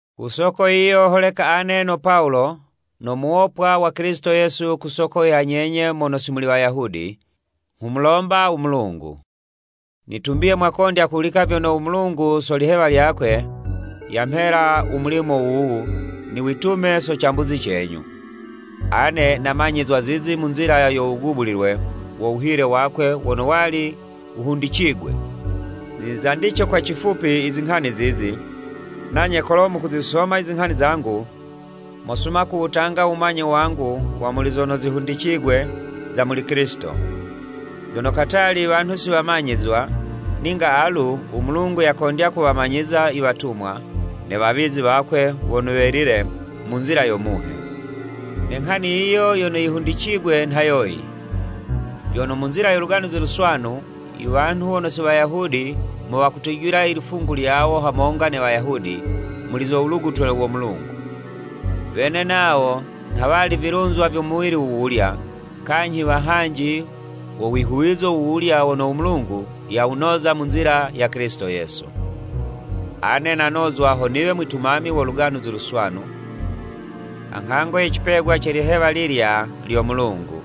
Ku soko yiyo holeka ane no Pawulo no muwopwa wa Kilisito Yesu ku soko ya nyenye mono si muli Wayahudi, nghumulomba u Mulungu. Nitumbiye mwakondya kuhulika vyono u Mulungu, so lihewa lyakwe, yamhela u mulimo wuwu, niwitume so cambuzi cenyu. Ane namanyizwa zizi mu nzila yo wugubulilwe wo wuhile wakwe wono wali wuhundicigwe. Nizandice kwa cifupi, izinghani zizi, nanye kolo mukuzisoma izinghani zangu, mosuma kuwutanga u wumanye wangu wa muli zono zihundicigwe za muli Kilisito. Zono katali wanhu si wamanyizwa, ninga alu u Mulungu yakondya kuwamanyiza iwatumwa, ne wawizi wakwe wono welile mu nzila yo Muhe. Ne nghani yiyo yono yihundicigwe nha yoyi, vyono mu nzila yo Luganuzi Luswanu, iwanhu wono si Wayahudi mo wakutujila ilifungu lyawo hamonga ne Wayahudi muli zo wulugutwe wo Mulungu, wene nawo nha wali vilunzwa vyo muwili wuwulya, kanyhi wahanji wo wihuwizo wuwulya wono u Mulungu yawunoza mu nzila ya Kilisito Yesu. Ane nanozwa ho niwe mwitumami wo Luganuzi Luswanu, ha nghango ye cipegwa ce lihewa lilya lyo Mulungu,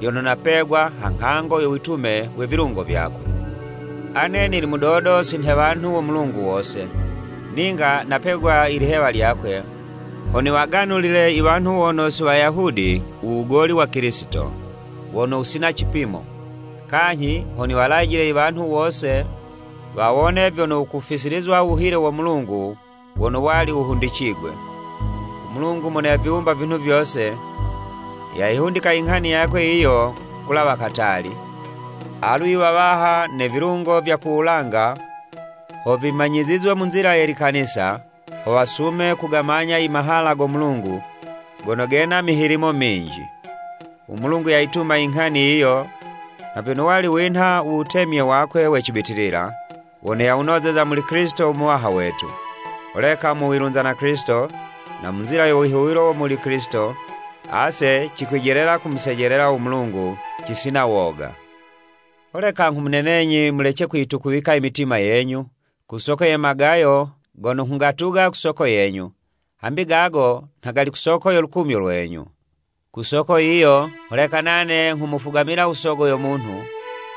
lyono napegwa ha nghango yo witume we vilungo vyakwe. Ane nili mudodo si nhe wanhu wo Mulungu wose, ninga napegwa ilihewa lyakwe, ho niwaganulile iwanhu wono si Wayahudi u wugoli wa Kilisito, wono wusina cipimo, kanyhi ho niwalajile iwanhu wose wawone vyono wukufisilizwa u wuhile wo Mulungu wono wali wuhundicigwe. U Mulungu mono yaviwumba vinhu vyose, yayihundika inghani yakwe yiyo kulawa katali, alu i wawaha ne vilungo vya ku wulanga ho vimanyizizwe mu nzila ye Likanisa, ho wasume kugamanya i mahala go Mulungu gono gena mihilimo minji. U Mulungu yayituma inghani yiyo nha vyono wali winha u wutemye wakwe we cibitilila, wono yawunozeza muli Kilisito u Muwaha wetu. Holeka mu wilunza na Kilisito, na mu nzila yo wihuwilo muli Kilisito, ase cikwijelela kumusejelela u Mulungu cisina woga. Holeka nghumunenenyi, mulece kuyitukuwika i mitima yenyu, ku soko ye magayo gono nghugatuga ku soko yenyu, hambi gago nha gali ku soko yo lukumyo lwenyu. Ku soko yiyo, holeka nane nghumufugamila u Sogo yo Munhu,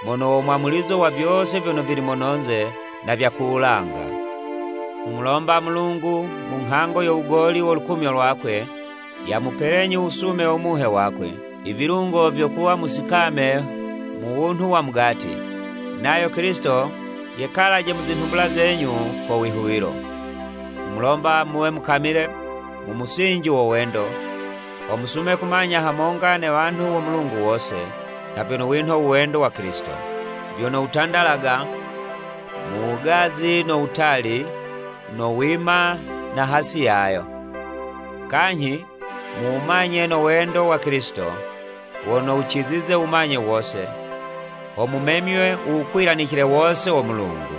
mono wo mwamulizo wa vyose vyono vili mono'nze na vya ku wulanga. Nghumulomba u Mulungu, mu nghango yo wugoli wo lukumyo lwakwe, yamupelenyi u wusume wo Muhe wakwe, i vilungo vyo kuwa musikame mu wunhu wa mugati, nayo Kilisito yekalaje mu zinhumbula zenyu ko wihuwilo. Nghumulomba muwe mukamile mu musinji wo wendo, ho musume kumanya hamonga ne wanhu wo Mulungu wose, nha vyono winha u wendo wa Kilisito, vyono wutandalaga mu wugazi no wutali, no wima na hasi yayo. Kanyhi muwumanye no wendo wa Kilisito, wono wucizize wumanye wose, ho mumemywe u wukwilanicile wose wo Mulungu.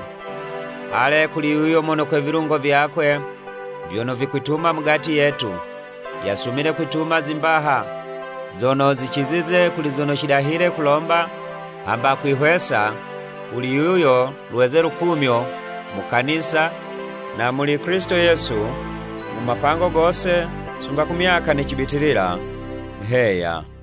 Ale kuli yuyo mono kwe vilungo vyakwe vyono vikwituma mugati yetu, yasumile kwituma zimbaha zono zicizize kuli zono cidahile kulomba hamba kwihwesa, kuli yuyo lweze lukumyo mu Kanisa na muli Kilisito Yesu, mu mapango gose sunga ku myaka ne cibitilila. Heya.